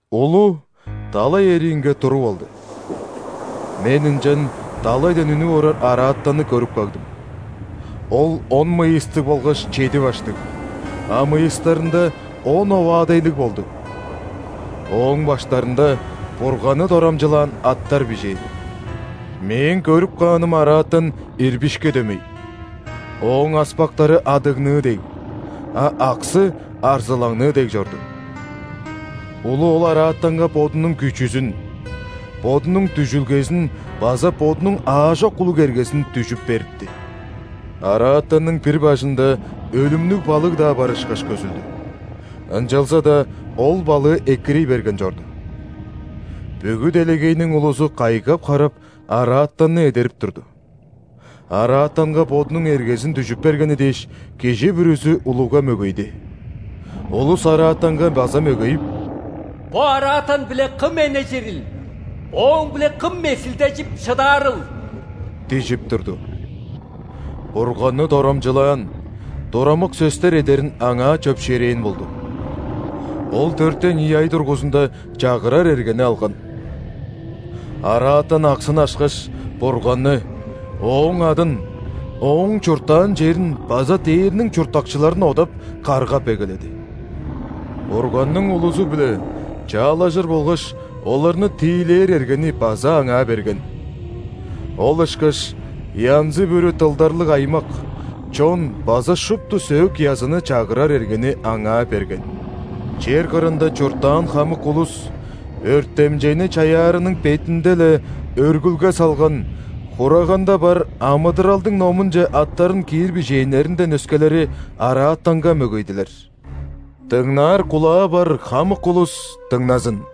Улу далай эриинге туруп алды. Мен ынчан далайдан үнүп орар араатанны көрүп кагдым. Ол он мыйыстыг болгаш чеди баштыг, а мыйыстарында он оваадайлыг болду. Ооң баштарында Бурганны дорамчылаан аттар бижээн. Мээң көрүп кааным араатан ирбишке дөмей, ооң аспактары адыгныы дег, а аксы арзылаңныы дег чорду. Улу ол араатанга бодунуң күчүзүн, бодунуң дүжүлгезин база бодунуң аажок улуг эргезин дүжүп берипти. Араатанның бир бажында өлүмнүг балыг-даа бар ышкаш көзүлдү, ынчалза-даа ол балыы экирий берген чорду. Бүгү делегейниң улузу кайгап-харап, араатанны эдерип турду. Араатанга бодунуң эргезин дүжүп бергени дээш, кижи бүрүзү улуга мөгейди. Улус араатанга база мөгейип: «Бо араатан-биле кым эннежирил, ооң-биле кым месилдежип шыдаарыл?» – дижип турду. Бурганны дорамчылаан, турамык сөстер эдерин аңаа чөпшээрээн болду. Ол дөртен ийи ай дургузунда чагырар эргени алган. Араатан аксын ашкаш, Бурганны, Ооң адын, Ооң чурттаан черин база дээрниң чурттакчыларын одап, каргап эгеледи. Бурганның улузу-биле чаалажыр болгаш оларны тиилээр эргени база аңаа берген. Ол ышкаш янзы-бүрү дылдарлыг аймак, чон база шупту сөөк-языны чагырар эргени аңаа берген. Чер кырында чурттаан хамык улус – өртемчейни чаяарының бетинде-ле өргүлге салган Хураганда бар амыдыралдың номунче аттарын киир бижээннеринден өскелери, араатанга мөгейдилер. Дыңнаар кулаа бар хамык улус дыңназын!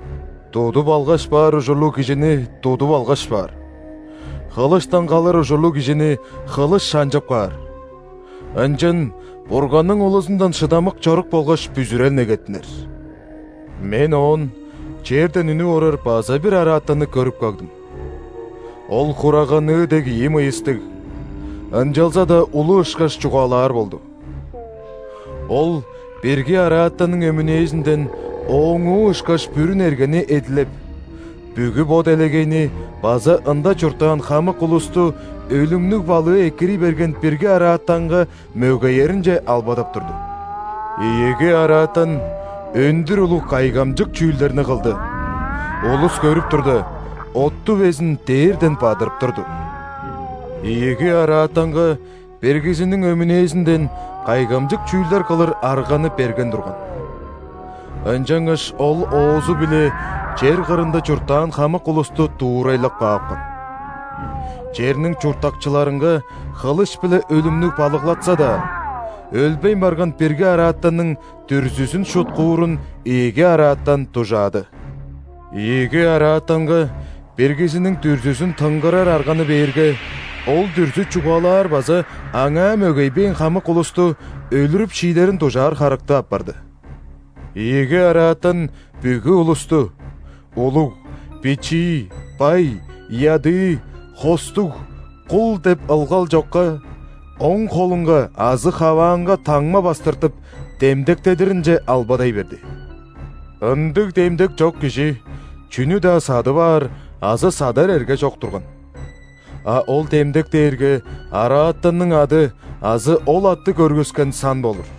Тудуп алгаш баар ужурлуг кижини тудуп алгаш баар. Хылыштан калыр ужурлуг кижини хылыш шанчып каар. Ынчан Бурганның улузундан шыдамык чорук болгаш бүзүрел негеттинер. Мен оон черден үнүп орар база бир араатанны көрүп кагдым. Ол хураганныы дег ийи мыйыстыг, ынчалза-даа улу ышкаш чугаалаар болду. Ол бирги араатанның өмүнээзинден ооңуу ышкаш бүрүн эргени эдилеп, бүгү бо делегейни база ында чурттаан хамык улусту өлүмнүг балыы экирий берген бирги араатанга мөгееринче албадап турду. Ийиги араатан өндүр улуг кайгамчык чүүлдерни кылды: улус көрүп турда, отту безин дээрден бадырып турду. Ийиги араатанга биргизиниң өмүнээзинден кайгамчык чүүлдер кылыр арганы берген турган. Ынчангаш ол оозу-биле чер кырында чурттаан хамык улусту дуурайлап каапкан. Черниң чурттакчыларынга хылыш-биле өлүмнүг балыглатса-даа, өлбейн барган бирги араатанның дүрзүзүн шуткуурун ийиги араатан дужаады. Ийиги араатанга биргизиниң дүрзүзүн тынгарар арганы бээрге, ол дүрзү чугаалаар база аңаа мөгейбээн хамык улусту өлүрүп шиидерин дужаар харыктыг апарды. Ийиги араатан бүгү улусту: улуг, бичии, бай, ядыы, хостуг, кул деп ылгал чокка, оң холунга азы хаваанга таңма бастыртып, демдектедиринче албадай берди. Ындыг демдек чок кижи чүнү-даа садып аар азы садар эрге чок турган. А ол демдек дээрге араатанның ады азы ол атты көргүскен сан болур.